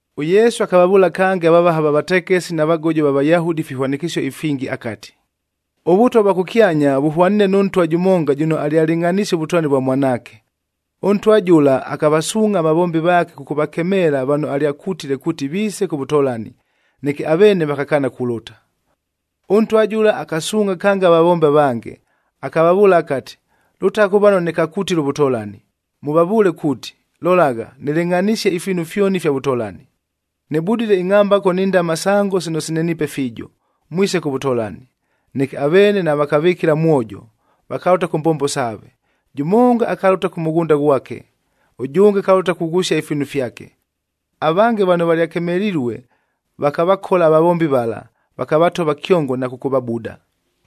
ɄYesu akavavʉʉla kange avavaha va vatekesi na vagojo va Vayahudi ifihwanɨkɨsio ifingi akati, “ɄVʉtwa vwa kʉkyanya vʉhwaniine nʉ ntwa jʉmonga jʉno alyalɨngʼhanisie ʉvʉtolani vwa mwanaake. Ʉntwa jʉla akavasuungʼha avavombi vaake kʉkʉvakemeela vano alyakutile kuuti viise kʉ vʉtolani, neke aveene vakakaana kulʉta. “Ʉntwa jʉla akasuungʼha kange avavombi avange, akavavʉʉla akati, ‘Lʉtagha kʉ vano nɨkakutile ʉvʉtolani, mʉvavʉʉle kuuti, “Lolagha, nɨlɨngʼhanisie ifiinu fyoni ifya vʉtolani. Nɨbudile ingʼhambako ni ndama sango sino sineniipe fiijo. Mwise kʉ vʉtolani!” ’ Neke aveene navakavɨkɨla mwojo, vakalʉta kʉ mbombo saave: jʉmonga akalʉta kʉ mʉghʉnda ghwake, ʉjʉnge akalʉta kughʉsia ifiinu fyake. Avange vano valyakemelilue vakavakola avavombi vala, vakavatova kyongo na kʉkʉvabuda.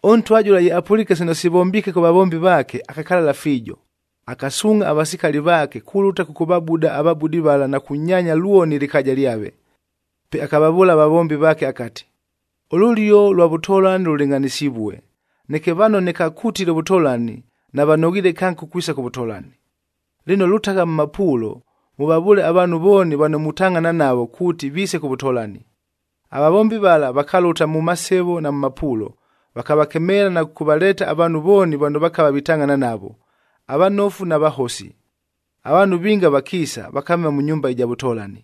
“Ʉntwa jʉla ye apʉliike sino sivombiike kʉ vavombi vaake, akakalala fiijo, akasuungʼha avasikali vaake kulʉta kʉkʉvabuda avabudi vala na kunyaanya lwoni ɨlɨkaaja lyave. Pe akavavʉʉla avavombi vaake akati, ‘Ʉlʉlio lwa vʉtolani lʉlɨngʼhanɨsivue, neke vano nɨkakutile ʉvʉtolani, navanoghiile kange kukwisa kʉ vʉtolani. Lɨno, lʉtagha mʉ mapuulo, mʉvavʉʉle avaanhu vooni vano mutangʼhana navo kuuti viise kʉ vʉtolani.’ Avavombi vala vakalʉta mʉ masevo na mʉ mapuulo, vakavakemeela na kʉkʉvaleeta avaanhu vooni vano vakava vitangʼhana navo, avanofu na vahosi. Avaanhu vinga vakiisa, vakamema mʉ nyumba ɨja vʉtolani.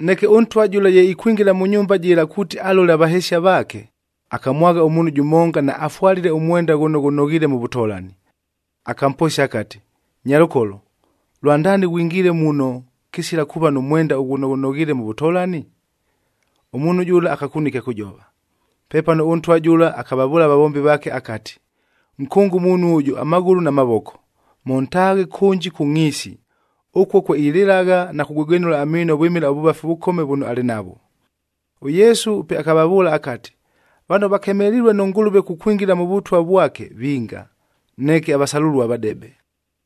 “Neke ʉntwa jʉla ye ikwingila mʉ nyumba jɨla kuuti alole avahesia vaake, akamwagha ʉmuunhu jʉmonga naafwalile ʉmwenda ghʉno ghʉnoghiile mʉ vʉtolani. Akamposia akati, ‘Nyalʉkolo, lwandaani ghwingile muno kɨsila kuuva nʉ mwenda ghʉno ghʉnoghiile mʉ vʉtolani?’ Ʉmuunhu jʉla akakunua ɨkya kʉjova. Pepano ʉntwa jʉla akavavʉʉla avavombi vaake akati, ‘Nkʉnge ʉmuunhu ʉjʉ amaghʉlʉ na mavoko, mʉntaaghe kʉnji kʉ ngʼhiisi. Ʉkuo kwe ilɨlagha na kugwegwenʉla amiino vwɨmɨla ʉvʉvafi ʉvʉkome vʉno alɨ navwo.’” ɄYesu pe akavavʉʉla akati, “Vano vakemelilue nʉ Ngʉlʉve kukwingila mʉ Vʉtwa vwake vinga, neke avasalʉlua vadebe.”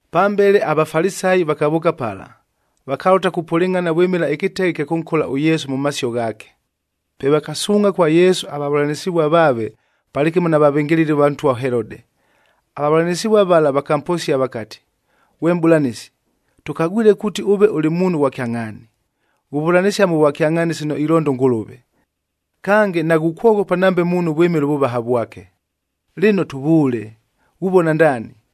Pambele aVafalisayi vakavʉʉka pala, vakalʉta kupʉlɨngʼhana vwɨmɨla ɨkɨteghe ɨkya kʉnkola ʉYesu mʉ masio ghaake. Pe vakasuungʼha kwa Yesu avavʉlanɨsɨvua vaave palɨkɨmo na vavɨngɨlɨli va ntwa ʉHelode.a Avavʉlanɨsɨvua vala vakamposia vakati, “Ghwe Mʼbʉlanɨsi, tʉkagwile kuuti ʉve ʉlɨ muunhu ghwa kyangʼhaani, ghuvʉlanɨsia mʉ vwakyangʼhaani sino ilonda ʉNgʉlʉve. Kange, naghukwoghopa nambe muunhu vwɨmɨla ʉvʉvaha vwake. Lɨno tʉvʉʉle, ghuvona ndaani!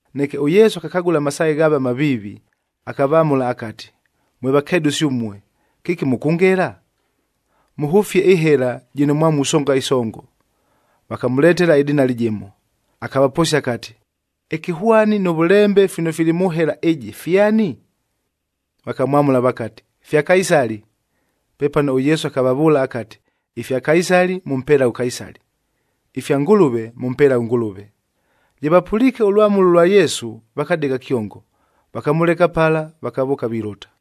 Neke ʉYesu akakagʉla amasaaghe ghaave amaviivi, akavamʉla akati, “Mwe vakedʉsi ʉmue, kɨki mʉkʉngela? Mʉhʉfie ɨhela jɨno mwa musonga ɨsongo.” Vakamʉletela ɨdinali jɨmo. Akavaposia akati, “Ɨkɨhwani nʉ vʉlembe fino fili mʉ hela ɨjɨ fyani?” Vakamwamʉla vakati, “Fya Kaisali!” Pepano ʉYesu akavavʉʉla akati, “Ifya Kaisali, mʉmpelaghe ʉKaisali; ifya Ngʉlʉve, mʉmpelaghe ʉNgʉlʉve.” Ye vapʉliike ʉlwamʉlo lwa Yesu, vakadegha kyongo. Vakamʉleka pala, vakavʉʉka vilʉta.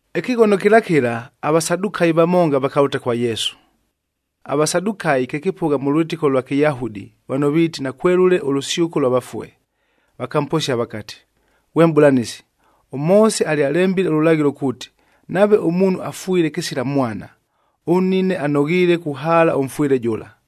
Ɨkɨghono kɨla kɨla, aVasadukayi vamonga vakalʉta kwa Yesu. AVasadukayi kye kɨpʉgha mʉ lwɨtɨko lwa Kɨyahudi vano viiti nakwelʉle ʉlʉsyʉko lwa vafue. Vakamposia vakati, “Ghwe Mʼbʉlanɨsi, ʉMoose alyalembile ʉlʉlaghɨlo kuuti, nave ʉmuunhu afwile kɨsila mwana, ʉnnine anoghiile kuhaala ʉmfwɨle jʉla,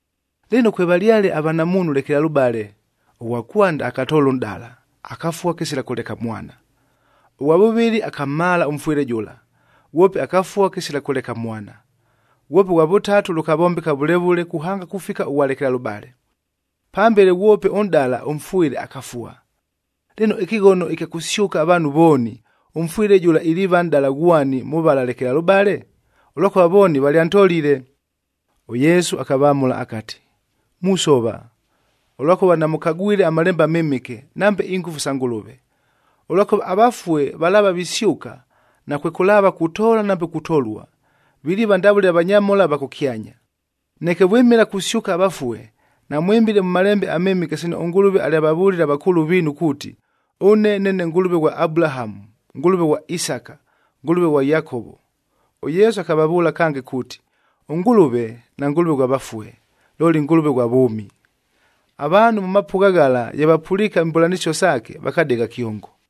Lɨno, kwevalyale avanamuunhu lekelalʉbale. Ʉghwa kwanda akatoola ʉnʼdala, akafua kɨsila kʉleka mwana. Ʉghwa vʉvɨlɨ akamhaala ʉmfwɨle jʉla, ghwope akafua kɨsila kʉleka mwana. Ghwope ʉghwa vʉtatu lʉkavombeka vʉle vʉle kuhanga kufika ʉghwa lekelalʉbale. Pambele, ghwope ʉnʼdala ʉmfwɨle, akafua. Lɨno, ɨkɨghono ɨkya kʉsyʉka avaanhu vooni, ʉmfwɨle jʉla iliiva nʼdala ghwani mʉ vala lekelalʉbale? Ʉlwakʉva vooni valyantolile!” ɄYesu akavamʉla akati, “Musova, ʉlwakʉva namʉkagwile aMalembe aMɨmɨke, nambe ingʉfu sa Ngʉlʉve. Ʉlwakʉva avafue valaava visyʉka, nakwekʉlaava kutoola nambe kutolua, viliiva ndavʉle avanyamhola ava kʉkyanya. Neke vwɨmɨla kusyʉka avafue, namwɨmbile mʉ Malembe aMɨmɨke sino ʉNgʉlʉve alyavavʉlile avakʉʉlʉ viinu kuuti, ‘Ʉne neene Ngʉlʉve ghwa Abulahamu, Ngʉlʉve ghwa Isaka, Ngʉlʉve ghwa Yakovo.’ed ɄYesu akavavʉʉla kange kuuti, ʉNgʉlʉve naNgʉlʉve ghwa vafue, looli Ngʉlʉve ghwa vʉʉmi!” Avaanhu mʉ mapʉgha ghala ye vapʉliike imbʉlanɨsio saake, vakadegha kyongo.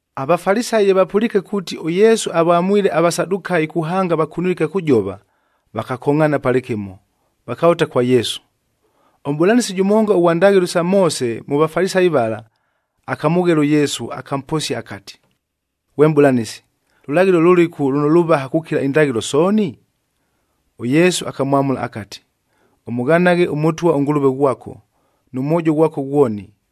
AVafalisayi ye vapʉliike kuuti ʉYesu avamwile aVasadukayi kuhanga vakunilue ɨkya kʉjova, vakakongʼhaana palɨkɨmo, vakalʉta kwa Yesu. Ʉmʼbʉlanɨsi jʉmonga ʉghwa ndaghɨlo sa Moose mʉ Vafalisayi vala, akamʉghela ʉYesu, akamposia akati, “Ghwe Mʼbʉlanɨsi, lʉlaghɨlo lʉlɨku lʉno lʉvaha kukila indaghɨlo sooni?” ɄYesu akamwamʉla akati, “ ‘Ʉmʉghanaghe ʉMʉtwa ʉNgʉlʉve ghwako nʉ mwojo ghwako ghwoni,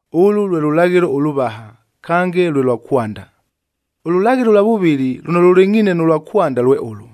Ʉlʉ lwe lʉlaghɨlo ʉlʉvaha, kange lwe lwa kwanda. Ʉlʉlaghɨlo ʉlwa vʉvɨlɨ lʉno lʉlɨngʼhiine nʉ lwa kwanda, lwe ʉlʉ,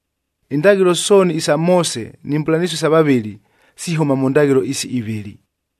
Indaghɨlo sooni isa Moose ni mbʉlanɨsio isa vavɨli sihʉma mʉ ndaghɨlo isi ivɨlɨ.”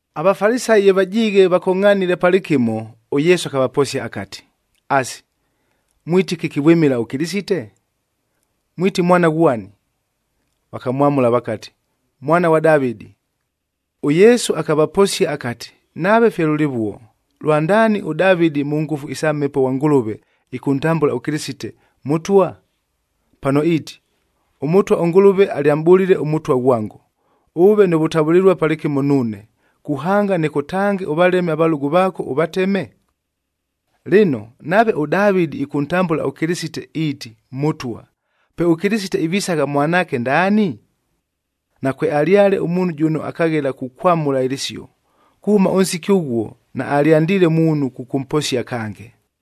AVafalisayi ye vajiighe vakongʼhanile palɨkɨmo, ʉYesu akavaposia akati, “Asi, mwiti kɨki vwɨmɨla ʉKɨlɨsite? Mwiti mwana ghwani?” Vakamwamʉla vakati, “Mwana ghwa Davɨdi.” ɄYesu akavaposia akati, “Nave fye lʉlɨvuo, lwandaani ʉDavɨdi mʉ ngʉfu isa Mhepo ghwa Ngʉlʉve, ɨkʉntambʉla ʉKɨlɨsite, ‘Mʉtwa’? Pano iiti, ‘ɄMʉtwa ʉNgʉlʉve alyamʼbʉlile ʉMʉtwa ghwango, “Ʉʉve nʉ vʉtavʉlɨlua palɨkɨmo nuune,h kuhanga nɨkʉtange ʉvaleme avalʉgʉ vaako, “Lɨno, nave ʉDavɨdi ɨkʉntambʉla ʉKɨlɨsite iiti, Mʉtwa, pe ʉKɨlɨsite ivisagha mwanaake ndaani?” Nakwealyale ʉmuunhu jʉno akaghela kukwamʉla ɨlɨsio. Kuhʉma ʉnsiki ʉghuo, naalyandiile muunhu kʉkʉmposia kange.